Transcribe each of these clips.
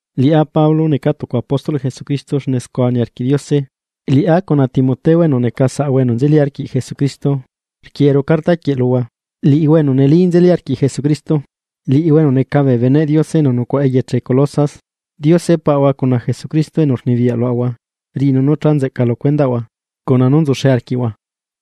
Liꞌá Pablo, necaa tucu apóstolꞌ Jesucristo xne scua niarquiꞌ Diose. Liꞌá cuna Timoteo enu neca saꞌahua enu nzeli arquiꞌ Jesucristo, rquieꞌeru carta quieꞌ luhua, liꞌihua enu neli nzeli arquiꞌ Jesucristo, liꞌihua enu neca bee beneꞌ Diose enu nucuaꞌa eyeche Colosas. Diose Paꞌahua cuna Jesucristo enu rnibiyaꞌ luaꞌahua, riꞌinu nú cha nzeꞌca lu cuendaꞌhua cuna nú nzuxe arquiꞌhua.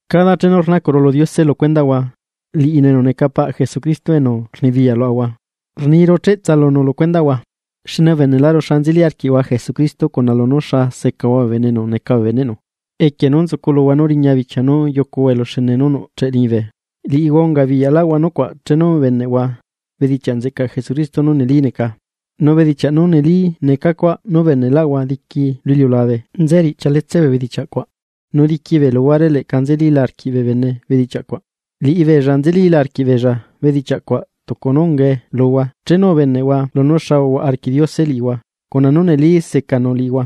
Cada chenu rnacuꞌru lu Diose lu cuendaꞌhua, liꞌinu enu neca paꞌ Jesucristo enu rnibiyaꞌ luaꞌahua, rniru cheꞌtsa lunu lu cuendaꞌhua. Xne ubeneꞌlaꞌru xa nzeli arquiꞌhua Jesucristo cuna lunú xa secahua bee bene enu neca bee beneꞌnu, equie nú nzuculuhua nú riña bichia nú yucuhua eluxene nú nuꞌcheꞌe liñibe. Liꞌihua ungabiyaꞌlaꞌhua nucuaꞌ chenu ubeneꞌhua bedichaꞌ nzeꞌcaꞌ Jesucristo nú neli neca. Nu bedichiaꞌ nú neli neca cuaꞌ nú ubeneꞌlaꞌhua diqui lu iliulabe nze riꞌchia letse bee bedichiaꞌ cuaꞌ nu diqui bee luhuare leꞌca nzelila arquiꞌ bee bene bedichiaꞌ cuaꞌ. Liꞌibeella nzelila arquiꞌbeella bedichiaꞌ cuaꞌ tucu nú ungae luhua chenu ubeneꞌhua lunú xa uhuaꞌa arquiꞌ Diose liꞌihua cuna nú neli secanu liꞌihua.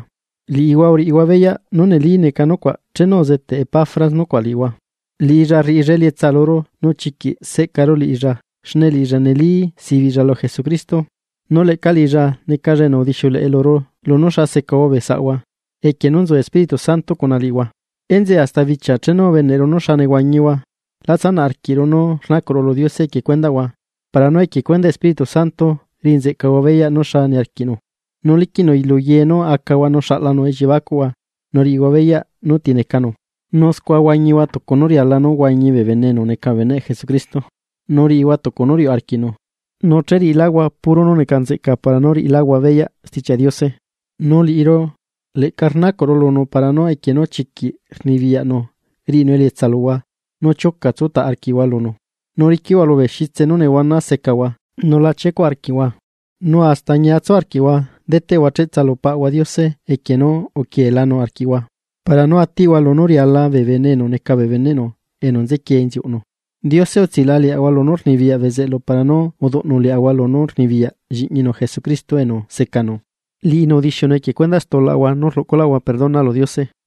Liꞌihua uriꞌihua beyaꞌ nú neli neca nucuaꞌ chenu uzeteꞌ Epafras nucuaꞌ liꞌihua. Liꞌilla rriꞌilla elietsa luru nu chiquiꞌ seꞌcaru liꞌilla xne liꞌilla neli sibiꞌlla lu Jesucristo. Nu leꞌca liꞌilla necalla enu udixiuleꞌe luru lunú xa secahua bee saꞌahua equie nú nzu Espíritu Santo cuna liꞌihua. Enzeꞌe hasta bichia chenu ubeneꞌru nú xa nehuañihua, la tsanaꞌ arquiꞌru nú rnacuꞌru lu Diose equie cuendaꞌhua para nú equie cuendaꞌ Espíritu Santo riꞌi nzeꞌcahua beyaꞌ nú xa niarquiꞌnu, nu liquiꞌnu lu ye nú acahua nu xaꞌlanu elliebacuꞌhua nú riꞌihua beyaꞌ nú ti necanu. Nu scua huañihua tucu nú riala nú huañi bee bene enu neca bee beneꞌ Jesucristo, nu riꞌihua tucu nú riuꞌ arquiꞌnu, nu che riꞌiláhua puro nú neca nzeꞌca para nú riꞌiláhua beyaꞌ Stichiaꞌ Diose. Nu liꞌiru leꞌca rnacuꞌru lunu para nú equie nú chiquiꞌ rnibiyaꞌnu riꞌinu elietsa luhua nú tsutaꞌ arquiꞌhua lunu, nu riquiꞌhua lubee xitse nú nehuana zecahua nu uluꞌcuhua paciencia. Nu hasta ñia tsu arquiꞌhua deteꞌhua cheꞌtsa lu Paꞌahua Diose equie nú uquieelanu arquiꞌhua para nú atiꞌhua lunú riala bee bene enu neca bee beneꞌnu enu nzequie inziuꞌnu. Diose utsilaꞌa liaꞌahua lunú rnibiyaꞌ bezeꞌlu para nú uduꞌnu liaꞌahua lunú rnibiyaꞌ Lliꞌñinu Jesucristo enu secanu. Liꞌinu udixiunu equie cuendaꞌ stulaꞌahua nú rluꞌcuꞌlaꞌahua perdona lu Diose.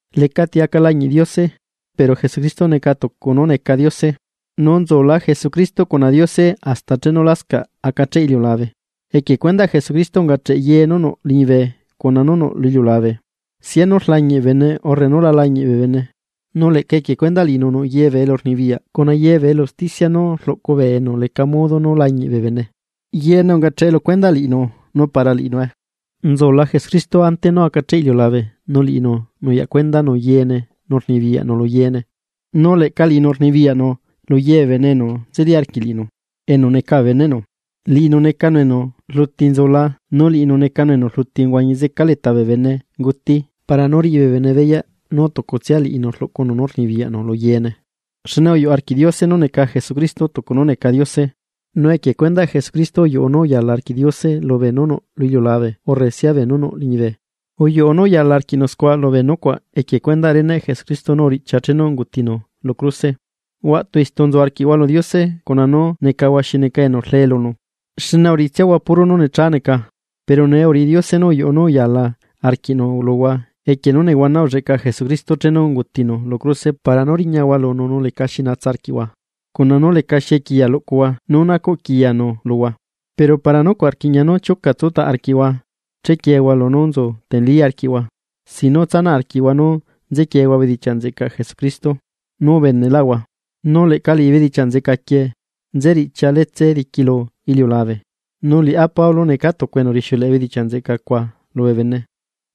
Lecati aca lañiꞌ Diose. Pero Jesucristo neca tucu nú neca Diose, nu nzula Jesucristo cuna Diose hasta chenu lascaꞌ acacheꞌ iliulabe. Equie cuendaꞌ Jesucristo ungacheꞌ ye nú nuꞌ liñibe cuna nú nuꞌ lu iliulabe, sianu rlañiꞌ bee bene urre nu la lañiꞌ bee bene, nu leꞌca equie cuendaꞌ liꞌinu nuꞌ yee bee elurnibiyaꞌ cuna yee bee elu usticia nú rluꞌcu bee enu leca modo nú lañiꞌ bee bene. Yeene ungacheꞌe lu cuendaꞌ liꞌinu nu para liꞌinue. Nzula Jesucristo ante nú acacheꞌ iliulabe nu liꞌinu nuyaꞌ cuendanu yeene nu rnibiyaꞌnu lu yeene. Nu leꞌca liꞌinu rnibiyaꞌnu lu ye bee bene enu nzeli arquiꞌ liꞌinu, enu neca bee beneꞌnu. Liꞌinu necanu enu rluti nzula, nu liꞌinu necanu enu rluti uhuañi zeca leta bee benenguti para nú riꞌi bee bene beyaꞌ nú tucutsia liꞌinu rluꞌcunu nú rnibiyaꞌnu lu yeene. Xne uyuꞌ arquiꞌ Diose nú neca Jesucristo tucu nú neca Diose. Nu equie cuendaꞌ Jesucristo uyuꞌu nú uyaala arquiꞌ Diose lubee nú nuꞌ lu iliulabe urre sia beenú nuꞌ liñibe, uyuꞌu nú uyaala arquiꞌnu scua lubee nucuaꞌ equie cuendaꞌ reneꞌ Jesucristo nú uriꞌchia chenu ungutinu lu cruse. Huaꞌtu istu nzu arquiꞌhua lu Diose cuna nú necahua xi neca enu rlee lunu, xne uriꞌitsiahua puro nú necha neca. Pero nee uriꞌi Diose nú uyuꞌu nú uyaala arquiꞌnu luhua equie nú nehuana ulleꞌca Jesucristo chenu ungutinu lu cruse para nú riñahua lunu nu lecaxi natsa arquiꞌhua, cuna nú lecaxi equiya luꞌcuhua nú nacuꞌ quiyanu luhua. Pero para nucuaꞌ rquiꞌña nu chiuca tsutaꞌ arquiꞌhua chequiehua lunú nzu teneli arquiꞌhua, sin nú tsanaꞌ arquiꞌhua nú nzequiehua bedichiaꞌ nzeꞌcaꞌ Jesucristo nú ubeneꞌlaꞌhua. Nu leꞌca liꞌi bedichiaꞌ nzeꞌca quieꞌ nze riꞌchia letse diqui lu iliulabe, nu liꞌá Pablo, necaa tucu enu rixiuleꞌe bedichiaꞌ nzeꞌca cuaꞌ lubee bene.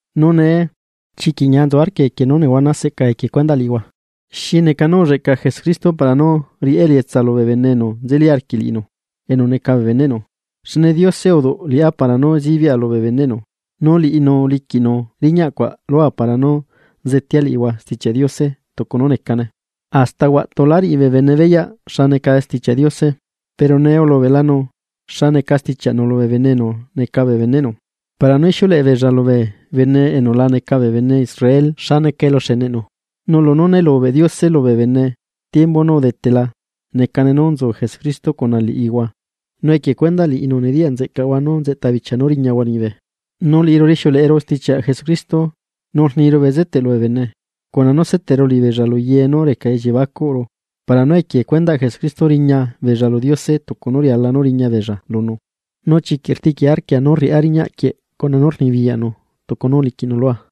Nu nee, chiquiꞌ ñia nzu arquia equie nú nehuana seꞌca equie cuendaꞌ liꞌihua. Xi neca nú ulleꞌca Jesucristo para nú riꞌá elietsa lubee bene enu nzeli arquiꞌ liꞌinu enu neca bee beneꞌnu. Xne Diose uduꞌu liꞌá para nú zibiꞌa lubee beneꞌnu. Nu liꞌinu uliquiꞌnu riñaꞌ cuaꞌ lua para nú zetea liꞌihua Stichiaꞌ Diose tucu nú necane. Hasta huaꞌtu lá riꞌi bee bene beyaꞌ xa neca Stichiaꞌ Diose. Pero nee ulubeꞌlanu xa neca stichiaꞌnu lubee bene enu neca bee beneꞌnu para nú ixiuleꞌe beella lubee bene enu la neca bee bene Israel xa neca eluxeneꞌnu. Nu lunú né lubeꞌ Diose lubee bene tiembu nú udetela necane nú nzu Jesucristo cuna liꞌihua, nu equie cuendaꞌ liꞌinu nediyaꞌ nzeꞌcaꞌhua nú nzeꞌta bichia nú riñahua liñibe. Nu liꞌiru rixiuleꞌeru stichiaꞌ Jesucristo, nu rniru bezeteꞌ lubee bene, cuna nú seteꞌru liꞌibeella lu ye nú reca elliebacuꞌru para nú equie cuendaꞌ Jesucristo riña beella lu Diose tucu nú riala nú riña beella lunu. Nu chiquiꞌ rtiꞌquia arquia nú riꞌá riñaꞌ quieꞌ cuna poder nú uliquiꞌnu lua.